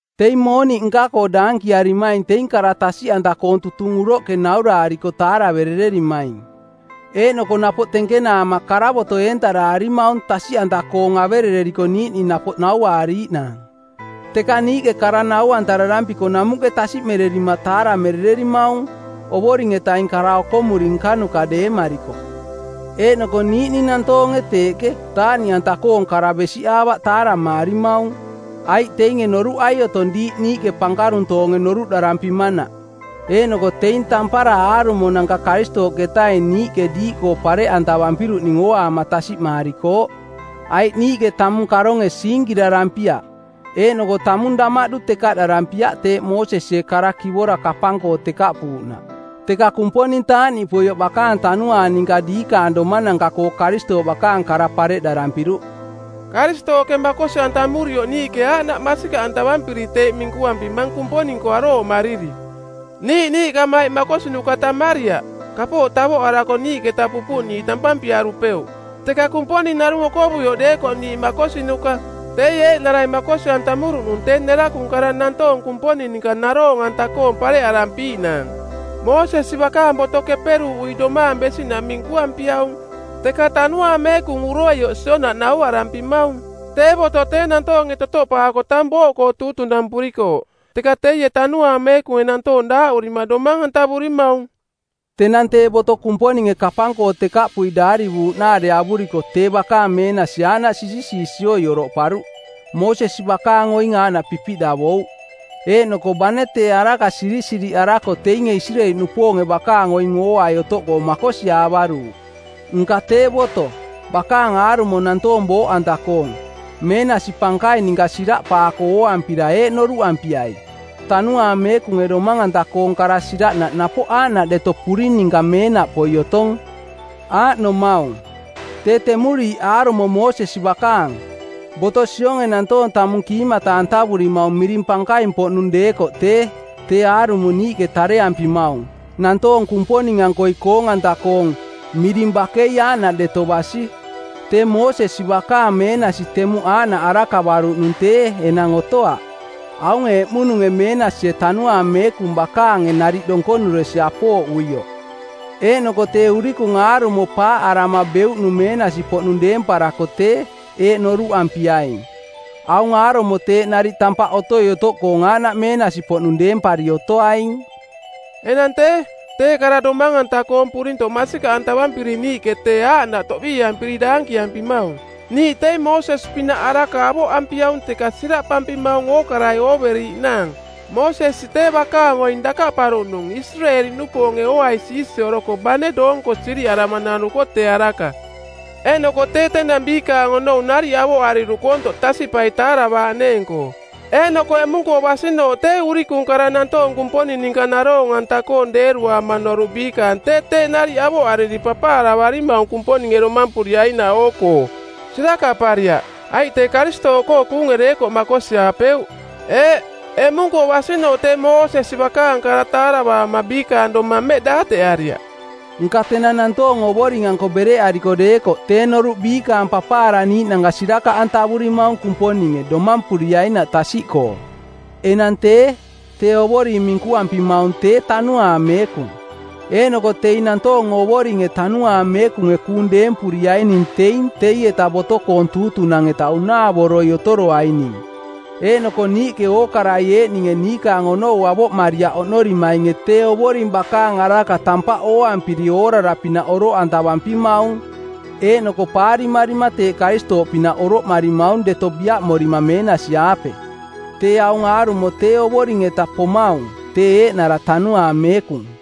Teing mooniꞌ nka-koo daankiarimaing teing kara tasiꞌanta-koong tutung uroꞌke nauraariko taaraverererimaing. Eeꞌnoko napoꞌ tenkenaama karavoto˜ eentaraarimaung tasiꞌanta-koong averereriko niiꞌning napoꞌ nauaariiꞌnaang. Teka niiꞌke kara nau-antararampiko namuꞌke tasiꞌmererima taaramerererimaung, Ovoring-etaing kara okomuri nkanuka deemariko. Eeꞌnoko niiꞌninge nantoonge teeꞌke taaꞌniꞌanta-koong kara besiꞌaavaꞌ taaramaarimaung, aiꞌ teinge noruꞌai otong diiꞌ niiꞌke pankaruntoonge noruꞌdarampimanaꞌ. Eeꞌnoko teing tampara aarumonanka Karistooꞌketaing niiꞌke diiꞌkoo pareꞌantavampiruꞌning ooaama tasiꞌmaarikooꞌ. Aiꞌ niiꞌke tamung karonge siinkirarampiaꞌ, eeꞌnoko tamung damaꞌdu tekaꞌdarampiaꞌ teeꞌ Moosesie Kara Kivora kapang-koo tekaꞌpuuꞌnaꞌ, teka Kumponing taaꞌniꞌpoioꞌ bakaang Tanuaang ninka diikaang domananka-koo Karistooꞌ bakaang kara pareꞌdarampiruꞌ. Karistooꞌke makosi-antamurioꞌ niiꞌke aaꞌnaꞌ masikaꞌantavampiri teeꞌ minkuampimang Kumponing-koo arooꞌmariri. Niiꞌ niiꞌkamaiꞌ makosinuka tammariaꞌ. Kapooꞌ tavoꞌarako niiꞌketa pupuꞌniiꞌ tampampiarupeuꞌ, teka Kumponing narung okovuioꞌ deekoꞌ niiꞌ makosinuka. Teie eeꞌnarai makosi-antamuruꞌnung tee nerakung kara nantoong Kumponing ninka naroong-anta-koong pareꞌarampiiꞌnaang. Moosesi bakaang boto keperuuꞌui domaang besiꞌnaꞌ minkuampiaung, teka Tanuaang Meekung uroioꞌ sionaꞌ nauarampimaung. Tee boto tee nantoonge totoꞌpaako tang booꞌkoo tuutunampurikooꞌ, teka teie Tanuaang Meekunge nantoong daaꞌurima domang-antavurimaung. Tenang tee boto Kumponinge kapang-koo tekaꞌpui daarivuuꞌnaare avuriko tee bakaang meenasi aaꞌnaꞌ siisioi oroꞌparuꞌ. Moosesi bakaang oing aaꞌnaꞌ pipiꞌdavouꞌ, eeꞌnoko bane tee araka sirisiriꞌarako teinge Isireeli-nupoonge bakaang oing ooai otoꞌkoo makosiaavaruuꞌ. Nka tee boto, bakaang aarumo nantoong booꞌanta-koong, meenasi pankaing ninka siraꞌpaako ooampira eeꞌ noruꞌampiai: Tanuaang Meekunge domang-anta-koong kara siraꞌnaꞌ napoꞌ aaꞌnaꞌ deto puring ninka meenaꞌpoi otong. Aaꞌnomaung: tee temuriiꞌ aarumo Moosesi bakaang, boto sionge nantoong tamung kiimata-antavurimaung miring pankaimpoꞌnung deekoꞌ tee, tee aarumo niiꞌke tareampimaung, nantoong Kumponing-ankoi koong-anta-koong, miring bakei aaꞌnaꞌ deto basi. Tee Moosesi bakaang meenasi temuꞌ aaꞌnaꞌ arakavaruꞌnung tee enang otoaꞌ aunge eꞌmununge meenasie Tanuaang Meekung bakaange nariꞌ donkonuresi apooꞌuioꞌ. Eeꞌnoko tee urikung aarumo paaꞌarama beuꞌnung meenasi-poꞌnung deemparako tee, eeꞌ noruꞌampiaing: aung aarumo teeꞌ nariꞌ tampaꞌ otoi otoꞌkoong aaꞌnaꞌ meenasi-poꞌnung deempari otoaing. Enang tee, tee kara domang-anta-koong purintoꞌ masikaꞌantavampiri niiꞌke tee aaꞌnaꞌ toꞌbiiampiri daankiampimaung. Niiꞌ teing Moosesi pinaꞌ araka niikaang avoꞌampiaung teka siraꞌpampimaung ookarai ooveriiꞌnaang. Moosesi tee bakaang oing dakaꞌparuꞌnung Isireeli-nupoonge ooai siisioroko bane doonko siriꞌarama nanuko tee araka. Eeꞌnoko tee tenang biikaang onou nariꞌ avoꞌariruꞌ koontoꞌ tasiꞌpai taaravaaꞌneeng-koo. Eeꞌnoko eꞌmung-koo basinooꞌ tee urikung kara nantoong Kumponing ninka naroong-anta-koong deeruaama noruꞌ biikaang tee teeꞌ nariꞌ avoꞌariri papaaravarimaung Kumponinge domampuriainaꞌ oo-koo. Sirakaꞌpariaꞌ, aiꞌ tee Karistooꞌkoo kuunge deekoꞌ makosiaapeuꞌ. Eeꞌ, eꞌmung-koo basinooꞌ tee Moosesi bakaang kara taaravaama biikaang domang mmeꞌ daateꞌariaꞌ. Nka tenang nantoong Ovoring-anko bereꞌariko deekoꞌ tee noruꞌ biikaang papaaraniiꞌnanka sirakaꞌantavurimaung Kumponinge domampuriainaꞌ tasiꞌkoo. Enang tee, tee Ovoring minkuampimaung tee Tanuaang Meekung, eeꞌnoko teing nantoong Ovoringe Tanuaang Meekunge kuung deempuriaining teing teieta boto-koong tuutunang˜ eta unaavoroi otoroaining. Eeꞌnoko niiꞌke ookarai eeꞌninge niikaang onou avoꞌmariaꞌ oꞌnorimainge tee Ovoring bakaang araka tampaꞌ ooampiri oorara-pinaꞌ oroꞌantavampimaung, eeꞌnoko paarimarima teeꞌ Karistooꞌpinaꞌ oroꞌmarimaung deto biaꞌmorima meenasi-aape. Tee aung aarumo tee Ovoring-eta pomaung, tee eeꞌnara Tanuaang Meekung.